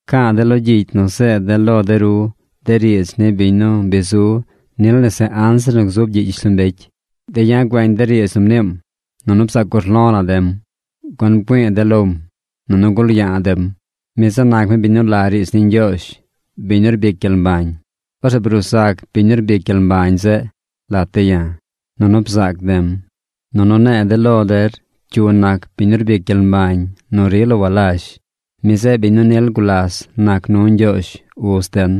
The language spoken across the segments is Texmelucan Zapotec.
Ca̱a̱ de̱ lo gyicy nu zeed de̱ lo de ru de riidz ni biñ nu bi zu nil nese anzir nu gzub gyiꞌ gyishlombecy. De̱ ya̱ güeñ de̱ riidz nu mniim. Nunu bzaac urlo̱ la̱ de̱m. Gun bgüi̱i̱ de̱ lom, nunu gul ya̱a̱ de̱m. Mi zeꞌ nac mi biñ nu la riidz ni Ñgyoozh, biñ nu rbic gyel mbañ. Orzeꞌ bruu zac biñ nu rbic gyel mbañ zeꞌ lat de̱ ya̱. Nunu bzac de̱m, nunu ne̱e̱ de̱ lo der cyu nac biñ nu rbic gyel mbañ nu rila walazh. Mi zeꞌ biñ nu nil gulas nac nu Ñgyoozh, Uz den.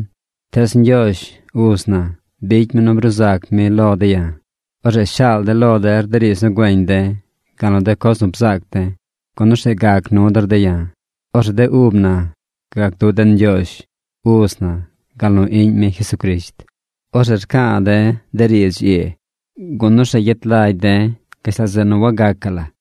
Tees Ñgyoozh, Uz na, bicy mi nu bruu zac mi lo de̱ ya̱. Orzeꞌ shaal de̱ lo der de riidz nu güeñ de̱, gal nu de coz nu bzaac de̱, gun orzeꞌ gac nu der de̱ ya̱. Orzeꞌ de ub na gac du den Ñgyoozh Uz na gal nu Iꞌñ mi Jesucrisht. Orzeꞌ rca̱a̱ de̱ de riidz ii, gun orzeꞌ gyet lagy de̱ gashtal zeꞌ nu wagacaꞌ la.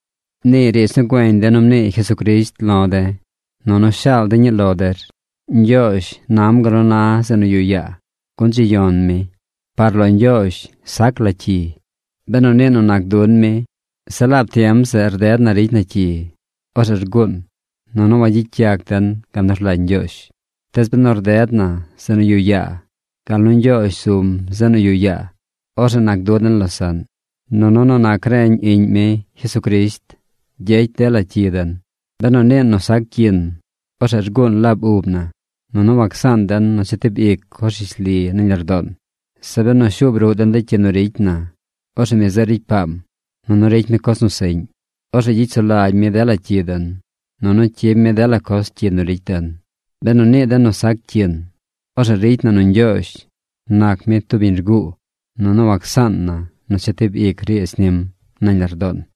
Nii riidz nu güeñ de̱ nu mnii Jesucrisht lo̱ de̱. Nunu shaal de̱ ñii lo der: Ñgyoozh nam gal nu na zeꞌ yuꞌ yaa, gun dzi yon mi. Par lo Ñgyoozh sac la cyi. Benu niin nu nac dun mi, zeꞌ laab tiem zeꞌ rded na ricy na cyi, orzeꞌ rguun, nunu wagyicy den gal nu rlagy Ñgyoozh. Tees benu rded na zeꞌ nu yuꞌ yaa gal nu Ñgyoozh zum zeꞌ nu yuꞌ yaa, orzeꞌ nac du den losaꞌn. Nunu nu nac reñ Iꞌñ mi, Jesucrisht, gyecy dela cyi den. Benu niin nu sac cyin, orzeꞌ rguun laab ub na, nunu wacsaan den nu chetib ic coz rishli nañ lardoon. Zeꞌ benu shuub ruꞌ den de cyi nu ricy na, orzeꞌ mi zeꞌ ricy paam, nunu ricy mi coz nu seꞌñ. Orzeꞌ gyicy sulagy mi dela cyi den, nunu cyib mi dela coz cyi nu ricy den. Benu nii den nu sac cyin, orzeꞌ ricy na nu Ñgyoozh nac mi tub biñ rguu, nunu wacsaan na nu chetib ic riidz nim nañ lardoon.